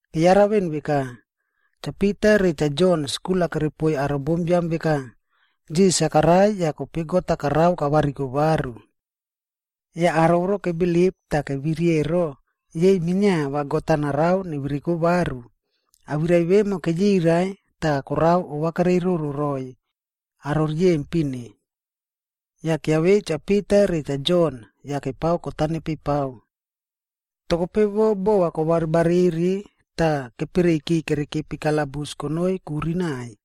Keyara veꞌen veka, Cha Pita re Cha Jon skul-a kerepoiy aro bombiam veka, Jisas-a karai yah kope God-a karao kavariko varu. Yah aro voro kebilip tah keviri ero, yei minia va God-a narao nevereko varu. Awirai vemo keyirai tah korao ovakereiroꞌro roiy aro riyempin-e. Yah kiavei Cha Pita re Cha Jon yah kepao kot-a nepeipao. Toh kope vo bova yah kobaribariri tah kepereiyki kerekepi kalabus konoi kuri naiy.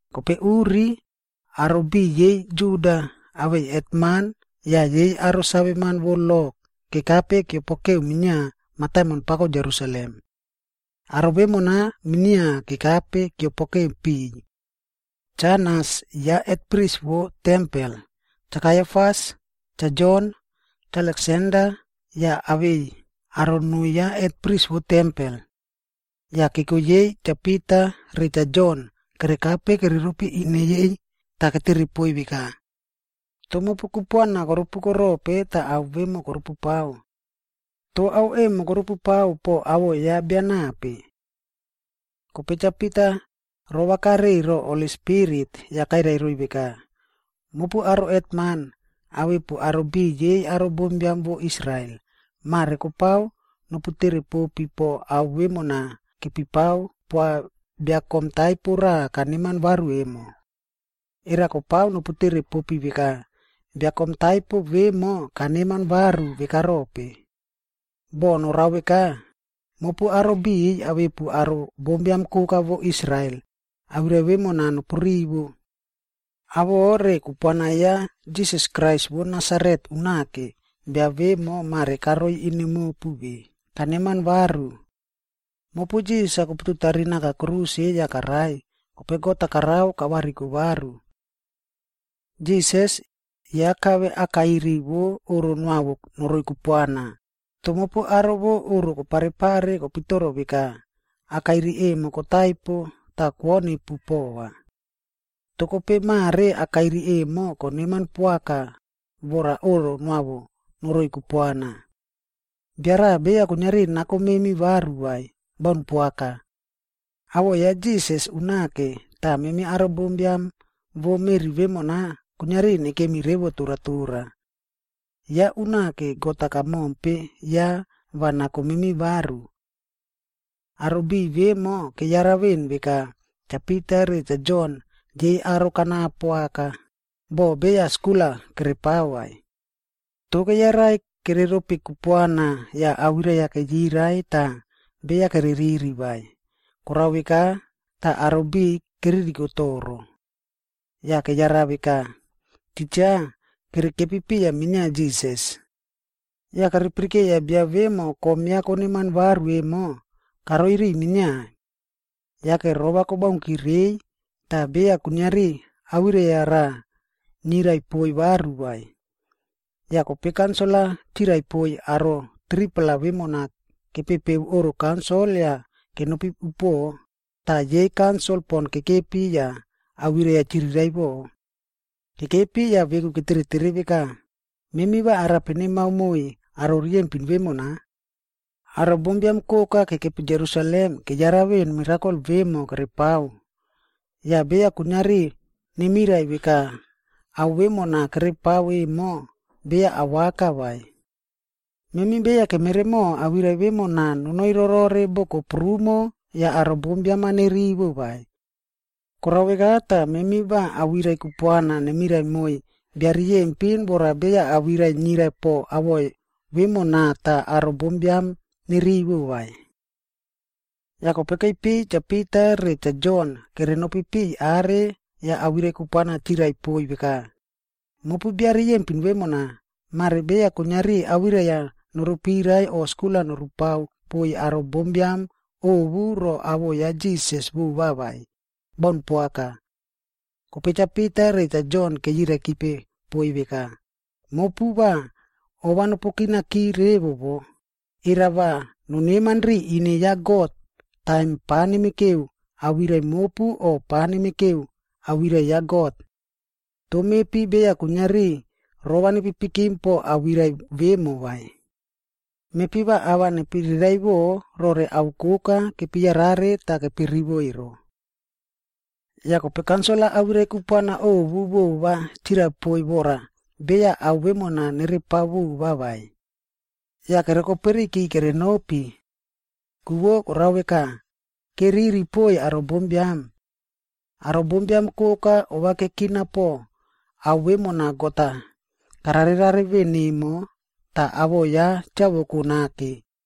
Kope uri, aro biꞌiy yei Juda, awei hetman yah yei aro saveman vo lo kekape kiopokeu minia mataimon pako Jerusalem.b Aro vemona minia kekape kiopokeke piꞌiy. Cha Anas ya hetpris vo tempel, Cha Kaiafas, Cha Jon, Cha Aleksander yah awei aro noo ya hetpris vo tempel. Yah keko yei Cha Pita re Cha Jon kerekape kereropi ine yei tah ketere poiy veka, “Toh mopu kupuana korupuko rope tah ao vemo korupupao? Toh ao emo korupupao po awoꞌo ya bia nape?” Kope Cha Pita rovakare ro Holi Spirit yah kairai roiy veka, “Mopu aro hetman, awepu aro biꞌiy yei aro bombiam vo Israel, mare kopao noputere popi po ao vemona kepipao poa bia kom taipo raꞌa kaneman varu emo. Era kopao noputere popi veka, bia kom taipo vemo kaneman varu veka rope? Boh norao veka, mopu aro biꞌiy awepu aro bombiam koka vo Israel, awirai vemona nopurivo. Awoꞌo re kupuana ya Jisas Krais vo Nasaret unake, bia vemo mare karoi ine mopu ve kaneman varu. Mopu Jisas-a kopututari naka kruse yah karai, kope God-a karao kavariko varu. Jisas, ya kave akairi vo oꞌro noavo noroi kupuana, toh mopu aro vo oꞌro koparepare kopitoro veka akairi emo kotaipo tah kwonipu pova. Toh kope mare akairi emo koneman poaka vora oꞌro noavo noroi kupuana.c Bia raꞌa beya kuiniari nako memi varu vai, baun poaka. Awoꞌo ya Jisas unake tah memi aro bombiam vo meꞌri vemona kuiniari nekimi revo torotora. Ya unake God-a kamompe ya va nako memi varu.” Aro biꞌiy vemo keyara veꞌen veka Cha Pita re Cha Jon yei aro kanapo aka, boh beya skul-a kerepao vai. Toh keyarai kereropi kupuana yah awirai-a keyirai tah beya kereriri vai, korao veka tah aro biꞌiy keririko toro. Yah keyara veka, titja kerekepi piya minia Jisas. Yah kepirikeiya bia vemo kom ya koneman varu emo, karoi riꞌiy minia. Yake, rova kobaunki reiy tah beya kuiniari awirai-a raꞌa niyrai poiy varu vai. Yah kope kaunsil-a chirai poiy aro 3-pla vemona kepepeu oꞌro kaunsil yah kenopi upuoꞌo, tah yei kaunsil pon kekepi yah awirai-a chiriraiꞌvo. Kekepi yah veku keteretere veka, “Memi va arape nemao moiy aro riyempin vemona? Aro bombiam koka kekepi Jerusalem keyara veꞌen mirakol vemo kerepao. Yah beya kuiniari nemirai veka ao vemona kerepao emo, beya awaka vai. Memi beya kemeremo awirai vemona nonoi rorore boko prumo yah aro bombiam-a nerivo vai. Korao veka tah memi va awirai kupuana nemirai moiy bia riyempin vora beya awirai niyrai po awoꞌo vemona tah aro bombiam-a nerivo vai.” Yah kope keipiy Cha Pita re Cha Jon kerenopi piꞌiy are yah awirai kupuana chirai poiy veka, “Mopu bia riyempin vemona, mare beya kuiniari awirai-a norupirai o skul-a nopao poiy aro bombiam ovu ro awoꞌo ya Jisas vova vai. Baun poaka.” Kope Cha Pita re Cha Jon keyiraikipe poiy veka, “Mopu va ova nopukinaki revo wo, era va noneman riya ine ya God, taim pa nepipikeu awirai mopu o pa nepipikeu awirai ya God? Toh mepi beya kuiniari rova nepipikim po awirai vemo vai. Mepi va ava nepiriraiꞌvo rore ao koka kepiyarare tah kepirivo ero.” Yah kope kaunsil-a awirai kupuana ovu vova chirai poiy vora beya ao vemona nerepao vova vai. Yah kerokoperiyki kerenopi. Ku vo korao veka, keriri poiy aro bombiam. Aro bombiam koka ovakekina po ao vemona God-a kararerare veꞌen emo, tah awoꞌo ya chavoko nake.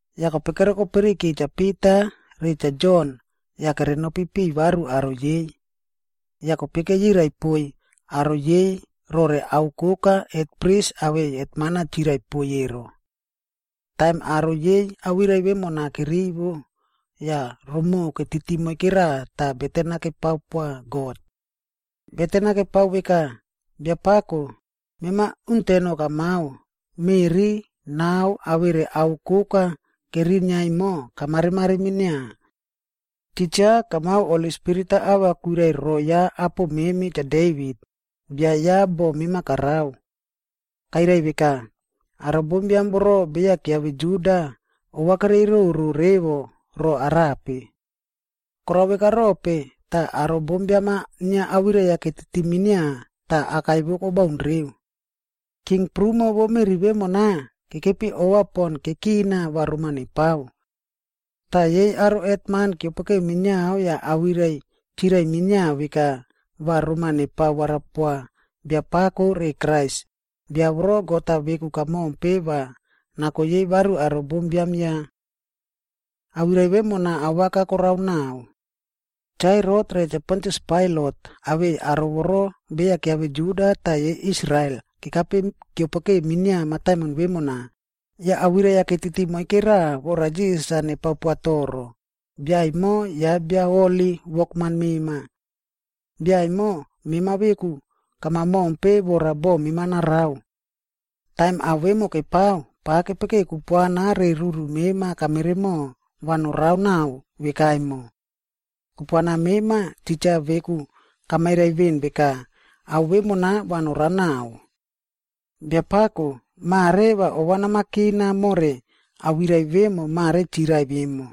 Yah kope kerokoperiyki Cha Pita re Cha Jon yah kerenopi piꞌiy varu aro yei. Yah kope keyirai poiy aro yei rore ao koka hetpris awei hetman-a chirai poiy ero. Taim aro yei awirai vemona kerivo, yah romoꞌo ketiti moikera tah beten-a kepao poa God. Beten-a kepao veka, “Biapako, mema uteno kamao, meꞌri, nao awere ao koka kerinia emo kamaremare minia. Titja kamao Holi Spirit-a ava kwirai roo ya apo memi Cha Devit, bia ya boꞌo mema karao. Kairai veka, ‘Aro bombiam voro beya kiave Juda, ovakereiroꞌro revo ro arape? Korao veka rope, tah aro bombiam-a inia awirai-a ketiti minia tah akai vo kobaun reu? King prumo vo meꞌri vemona, kekepi ova pon kekina va roma nepao. Tah yei aro hetman keopokeu minia yah awirai chirai minia veka va roma nepao warapoa Biapako re Krais, bia voro God-a veku kamompe va nako yei varu aro bombiam ya.’d Awirai vemona awaka korao naꞌao. Cha Herot re Cha Pontius Pailat awei aro voro beya kiave Juda tah yei Israel kekape keopokeu minia mataimon vemona, yah awirai-a ketiti moike raꞌa vora Jisas-a nepao poa toro, bia emo ya bia holi wokman mema. Bia emo mema veku kama mompe vora boꞌo mema narao. Taim ao vemo kepao, pava kepekeo kupuana re ruru mema kameremo va norao naꞌao vekaemo. Kupuana mema, titja veku kamairai veꞌen veka ao vemona va norao naꞌao. Biapako, mare va ova nama kina more awirai vemo mare chirai emo,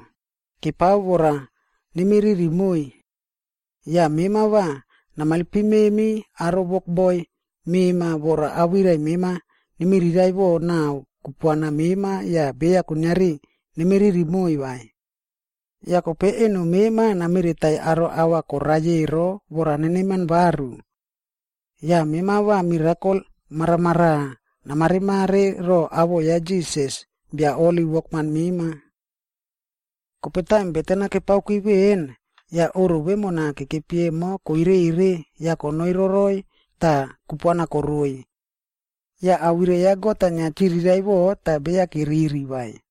kepao vora nemiriri moiy. Yah mema va namailpim memi aro wokboi mema vora awirai mema nemiriraiꞌvo nao kupuana mema yah beya kuiniari nemiriri moiy vai. Yah kope eno mema nameretaiy aro au-a korai ero vora neneman varu. Yah mema va mirakol maramaraꞌa namaremare ro awoꞌo ya Jisas, bia holi wokman mema.” Kope taim beten-a kepao veꞌen, yah oꞌro vemona kekepi emo kwerere yah ro kepe Holi Spirit tah kupuana koroiy. Yah awirai ya God-a inia chiriraiꞌvo tah beya keriri vai.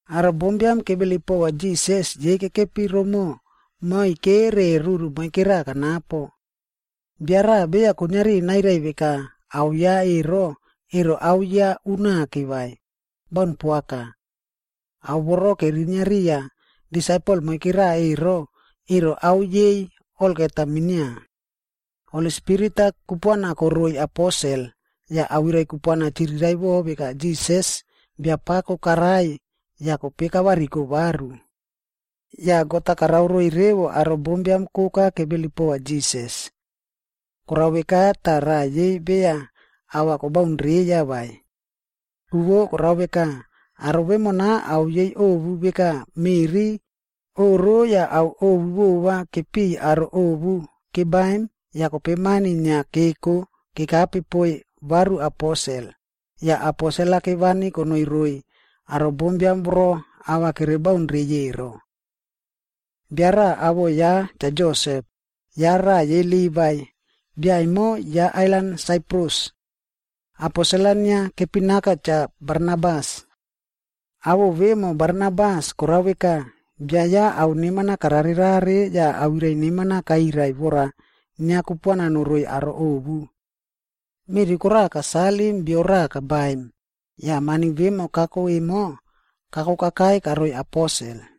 Aro bombiam kebilip pova Jisas yei kekepi romoꞌo moike re ruru moike raꞌa kanapo. Bia raꞌa beya kuiniari nairai veka ao ya ero, ero ao ya unake vai. Baun poaka. Ao voro kerinia riya disaipel moike raꞌa ero, ero ao yei olgeta minia. Holi Spirit-a kupuana koroiy aposel, yah awirai kupuana chiriraiꞌvo veka Jisas Biapako karai yah kope kavariko varu. Yah God-a karao roiy revo aro bombiam koka kebilip pova Jisas. Korao veka tah raꞌa yei beya ava kobaun reiya vai. Ku vo karao veka, aro vemona ao yei ovu veka meꞌri, oꞌro yah ao ovu vova kepiꞌiy aro ovu kebaim yah kope mani inia keko kekape poiy varu aposel, yah aposel-a kevani konoi roiy aro bombiam voro ava kere baun reiy ero. Bia raꞌa awoꞌo ya Cha Josep, ya raꞌa yei Livai, bia emo ya ailan Saiprus. Aposel-a inia kepinaka Cha Barnabas. Awoꞌo vemo Barnabas, korao veka, bia ya ao neman-a kararerare yah awirai neman-a kairai vora inia kupuana noroiy aro ovu.e Meꞌri koraꞌa kasalim bio raꞌa kabaim, yah mani vemo kako emo, kako kakai karoiy aposel.